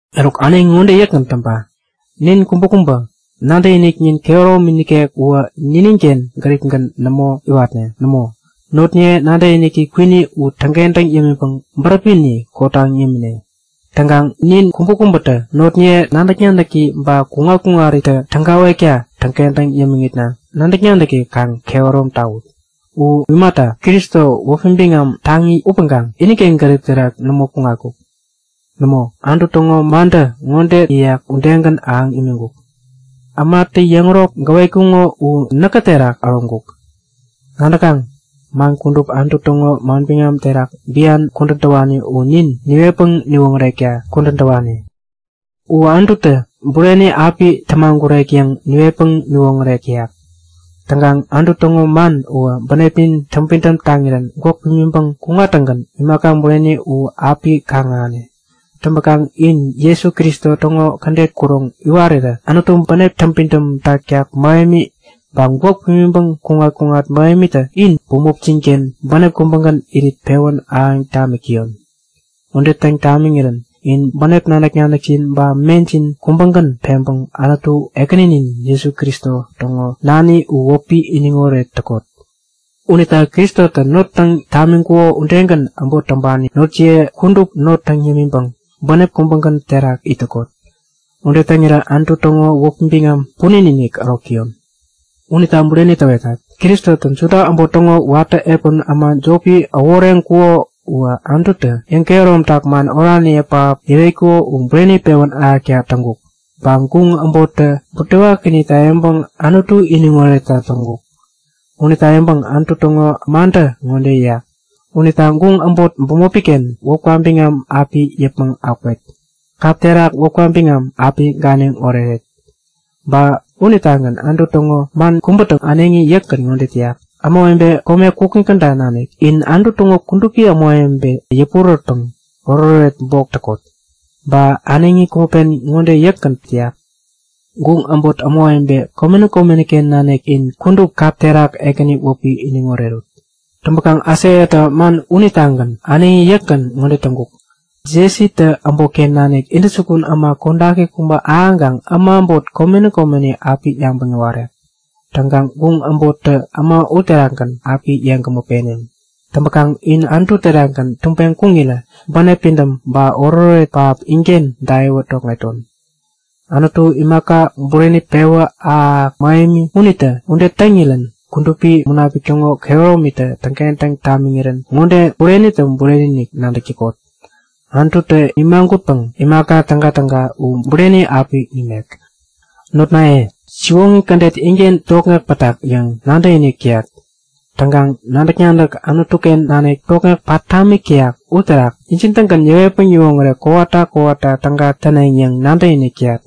Eruk, äneŋi ŋode yäkgän täŋpa; Nin kubäkubä nadäkiniknin kehäromi nikek uwä nininken gäripgän nämo iwatne. Nämo, notniye nadäkiniki kwini u täŋkentäŋ yämiŋpäŋ bäräpini kotaŋ yämine. Täŋkaŋ nin kubäkubätä notniye nadäk-nadäki ba kuŋat-kuŋaritä tägawekta täŋkentäŋ yämiŋitna nadäkiniki kaŋ kehärom tawut. U imata, Kristo, wäpi biŋam taŋi upäŋkaŋ iniken gärip terak nämo kuŋatkuk. Nämo, kädet Anutu täŋo mantä ŋode yäyak udegän ahäŋ imiŋkuk; Ämatä yäŋärok gäwetkuŋo u näkä terak äroŋkuk. Nadäkaŋ? Man kudup Anutu täŋo manbiŋam terak bian kudän täwani u nin niwetpäŋ niwoŋärekta kudän täwani. U Anututä bureni api tämagurek yäŋ niwetpäŋ niwoŋärek täyak. Täŋkaŋ Anutu täŋo man uwä bänepnin täŋpidäm taŋirän gwäk pimiŋpäŋ kuŋattäŋgän imaka bureni u api kaŋ-ahäne. Täŋpäkaŋ in Jesu Kristo täŋo kädet kuroŋ iwarirä Anutu bänep täŋpidäm taktak mähemi ba gwäk pimiŋpäŋ kuŋat-kuŋat mähemitä in bämopjin-ken bänep kubägän irit pewän ahäŋ tamik täyon. Ude täŋ tamiŋirän in bänep nadäk-nadäkjin ba mejin kubägän peŋpäŋ Anutu, Ekäninin Jesu Kristo täŋo nani u wäpi iniŋoret täkot. Unita Kristotä not täŋ tamiŋkuko udegän äbot täŋpani notjiye kudup not täŋ yämiŋpäŋ bänep kubägän terak it täkot. Ude täŋirä Anutu täŋo wäpi biŋam punin-inik ärok täyon. Unita bureni täwetat; Kristotä Juda äbot täŋo watä epän äma jopi äworeŋkuko uwä Anututä yäŋkehäromtak man oraniye pähap yäwetkuko u bureni pewän ahäkta täŋkuk. Ba guŋ äbottä butewakinita yäŋpäŋ Anutu iniŋoretta täŋkuk. Unita yäŋpäŋ Anutu täŋo mantä ŋode yäyak; Unita guŋ äbot bämopi-ken wäpka biŋam api yäpmäŋ akwet. Kap terak wäpka biŋam api ganiŋ oreret. Ba unitagän Anutu täŋo man kubätä äneŋi yäkgän ŋode täyak; Ämawebe kome kukŋi käda nanik in Anutu täŋo kudupi ämawebeniye yäpurärätpäŋ oretoret bok täkot. Ba äneŋi kubä pen ŋode yäkgän täyak; Guŋ äbot ämawebe, komeni komeni-ken nanik, in kudup kap terak Ekäni wäpi iniŋ orerut. Täŋpäkaŋ Aisaiatä man unitagän äneŋi yäkgän ŋode täŋkuk; Jesitä äbotken nanik intäjukun äma kodaki kubä ahäŋkaŋ äma äbot komeni komeni api yabäŋ yäwarek. Täŋkaŋ guŋ äbottä äma uterakgän api yeŋgämä peneŋ. Täŋpäkaŋ in Anutu terakgän tubeŋ kuŋirä bänep pidäm ba oretoret pähap inken daiwän tokŋeton. Anutu, imaka bureni pewä ahäk-ahäk mähemi unitä ude täŋirän Kudupi Munapik täŋo kehärominitä täŋkentäŋ tamiŋirän ŋode burenitä bureni-inik nadäk täkot; Anututä nimagutpäŋ imaka tägatäga u bureni api nimek. Notnaye, siwoŋi kädet inken tokŋek pätak yäŋ nadäkinik täyat. Täŋkaŋ nadäk-nadäk Anutu-ken nanik tokŋek pat tamik täyak uterak injin-tägän yäwetpäŋ yäwoŋärek kowata kowata täga täneŋ yäŋ nadäkinik täyat.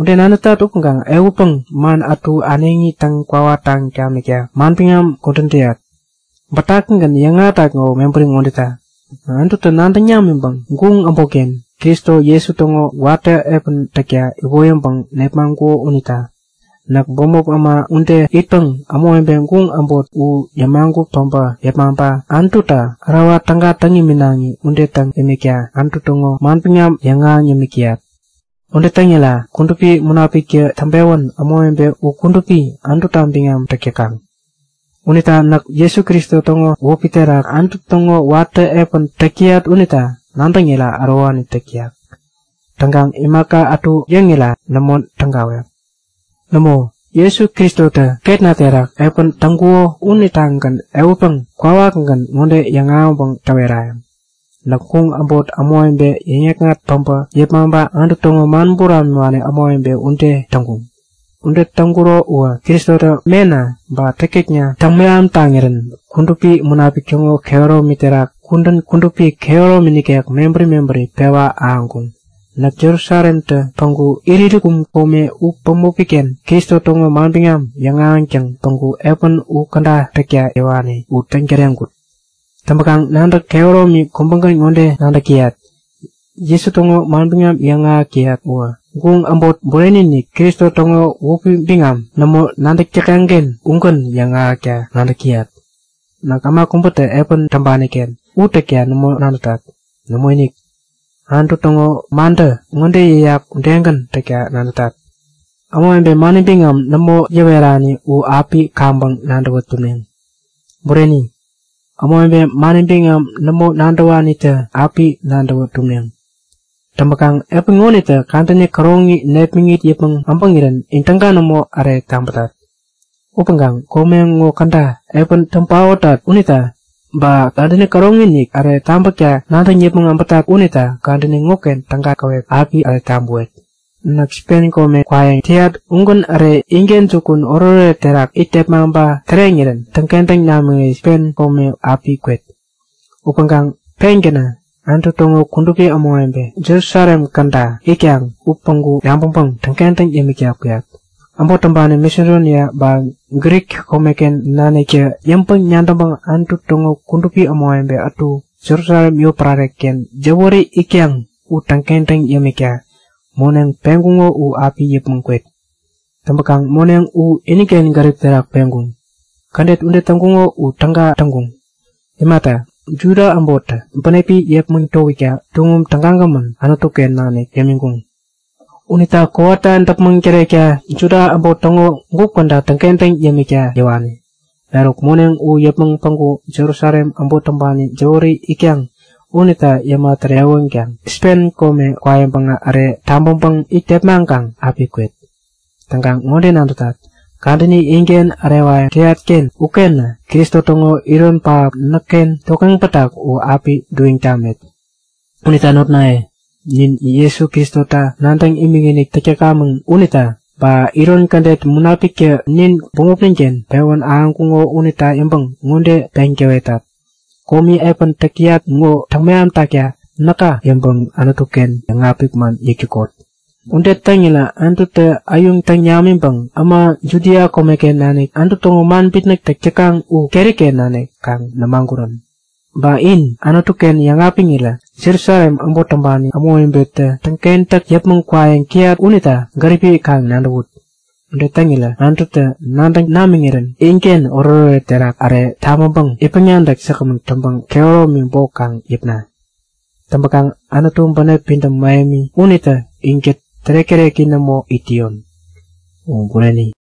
Ude nadätat upäŋkaŋ ehutpäŋ man ätu äneŋi täŋ-kwawataŋ tamikta manbiŋam ŋo kudän täyat. Bätakigän yäŋahätat ŋowä mebäri ŋodeta; Anututä nadäŋ namiŋpäŋ guŋ äbotken Kristo Jesu täŋo watä epän täkta iwoyäŋpäŋ nepmaŋkuko unita. Näk bämop äma ude itpäŋ ämawebe guŋ äbot u yämagut päbä yepmaŋpa Anututa ärawa täga täŋ iminaŋi ude täŋ imikta Anutu täŋo manbiŋam yäŋahäŋ yämik täyat. Ude täŋira Kudupi Munapiktä täŋpewän ämawebe u kudupi, Anututa biŋam täk täkaŋ. Unita näk Jesu Kristo täŋo wäpi terak Anutu täŋo watä epän täk täyat unita nadäŋira ärowani täk täyak. Täŋkaŋ imaka ätuta yäŋira nämo tägawek. Nämo, Jesu Kristotä ketna terak epän täŋkuko unitagän ehutpäŋ kwawakgän ŋode yäŋahäŋpäŋ täwerayäŋ; Näk guŋ äbot ämawebe yäŋ-yäkŋat päbä yepmaŋpa Anutu täŋo man buramiwani ämawebe ude täŋkuŋ. Ude täŋkuro uwä Kristotä mena ba täktäkna täŋmeham taŋirän Kudupi Munapik täŋo kehäromi terak kudän kudupi kehäromi nikek mebäri mebäri pewa ahäŋkuŋ. Näk Jerusalemtä päŋku Ilirikum kome u bämopi-ken Kristo täŋo manbiŋam yäŋahäŋtäŋ päŋku epän u käda täkta yäwani u täŋ täreŋkut. Täŋpäkaŋ nadäk kehäromi kubägän ŋode nadäk täyat; Jesu täŋo manbiŋam yäŋahäk täyat uwä, guŋ äbot bureni-inik, Kristo täŋo wäpi biŋam nämo nadäk täkaŋ-ken ugän yäŋahäkta nadäk täyat. Näk äma kubätä epän täŋpani-ken u täkta nämo nadätat. Nämoinik, Anutu täŋo mantä ŋode yäyak udegän täkta nadätat; Ämawebe mani biŋam nämo yäwerani u api kaŋpäŋ nadäwä tumneŋ. Bureni, ämawebe mani biŋam nämo nadäwanitä api nadäwä tumneŋ. Täŋpäkaŋ epän ŋonitä kadäni käroŋi nepmäŋit yäpmäŋ äbäŋirän in täga nämo äre tabätat. Upäŋ kome ŋo käda epän täŋ paotat unita, ba kadäni käroŋi-inik äre tabäkta nadäŋ yäpmäŋ äbätat unita kadäni ŋoken täga käwep api äre tabäwet. Näk Spen kome kwayäŋ täyat ugän äre inken jukun oretoret terak it tepmaŋpa täreŋirän täŋkentäŋ namiŋirä Spen kome api kwet. Upäŋkaŋ pengänä Anutu täŋo kudupi ämawebe Jerusalem käda itkaŋ u päŋku yabäŋpäŋ täŋkentäŋ yämikta kuyat. Äbot täŋpani Masedonia ba Grik komeken naniktä yäŋpäŋ-nadäŋpäŋ Anutu täŋo kudupi ämawebe ätu Jerusalem yotpärare-ken jäwäri itkaŋ u täŋkentäŋ yämikta moneŋ peŋkuŋo u api yäpmäŋ kwet. Täŋpäkaŋ moneŋ u iniken gärip terak peŋkuŋ. Kädet ude täŋkuŋo u täga täŋkuŋ. Imata, Juda äbottä bänepi yepmäŋ towikta tuŋum tägagämän Anutu-ken nanik yämiŋkuŋ. Unita kowata däpmäŋ tärekta Juda äbot täŋo gup käda täŋkentäŋ yämikta yäwani. Eruk moneŋ u yäpmäŋ päŋku Jerusalem äbot täŋpani jäwäri itkaŋ unita yäma tärewänkaŋ Spen kome kwa yäŋpäŋä äre tabäŋpäŋ it tepmaŋkaŋ api kwet. Täŋkaŋ ŋode nadätat; Kadäni inken ärewayäŋ täyat-ken ukenä Kristo täŋo iron pähap näkken tokŋeŋ pätak u api duiŋ tamet. Unita notnaye, nin Jesu Kristota nadäŋ imikinik täk täkamäŋ unita, ba iron kädet Munapiktä nin bämopnin-ken pewän ahäŋkuŋo unita yäŋpäŋ ŋode peŋ täwetat; Komi epän täyat ŋo täŋmeham takta näka yäŋpäŋ Anutu-ken yäŋapik man yäk täkot. Ude täŋirä Anututä äyuŋ täŋ namiŋpäŋ äma Judia komeken nanik Anutu täŋo man bitnäk täk täkaŋ u keri-ken nanik kaŋ nämagurän. Ba in Anutu-ken yäŋapiŋirä Jerusalem äbot täŋpani ämawebetä täŋkentäk yäpmäŋ kwayäŋ täyat unita gäripi kaŋ nadäwut. Ude täŋirä Anututä nadäŋ namiŋirän inken oretoret terak äre tabäŋpäŋ itpäŋ-nadäk säkgämän täŋpäŋ kehäromi bok kaŋ yäpna. Täŋpäkaŋ Anutu bänep pidäm mähemi unitä inkät tärek-täreki nämo it täyon. U Bureni.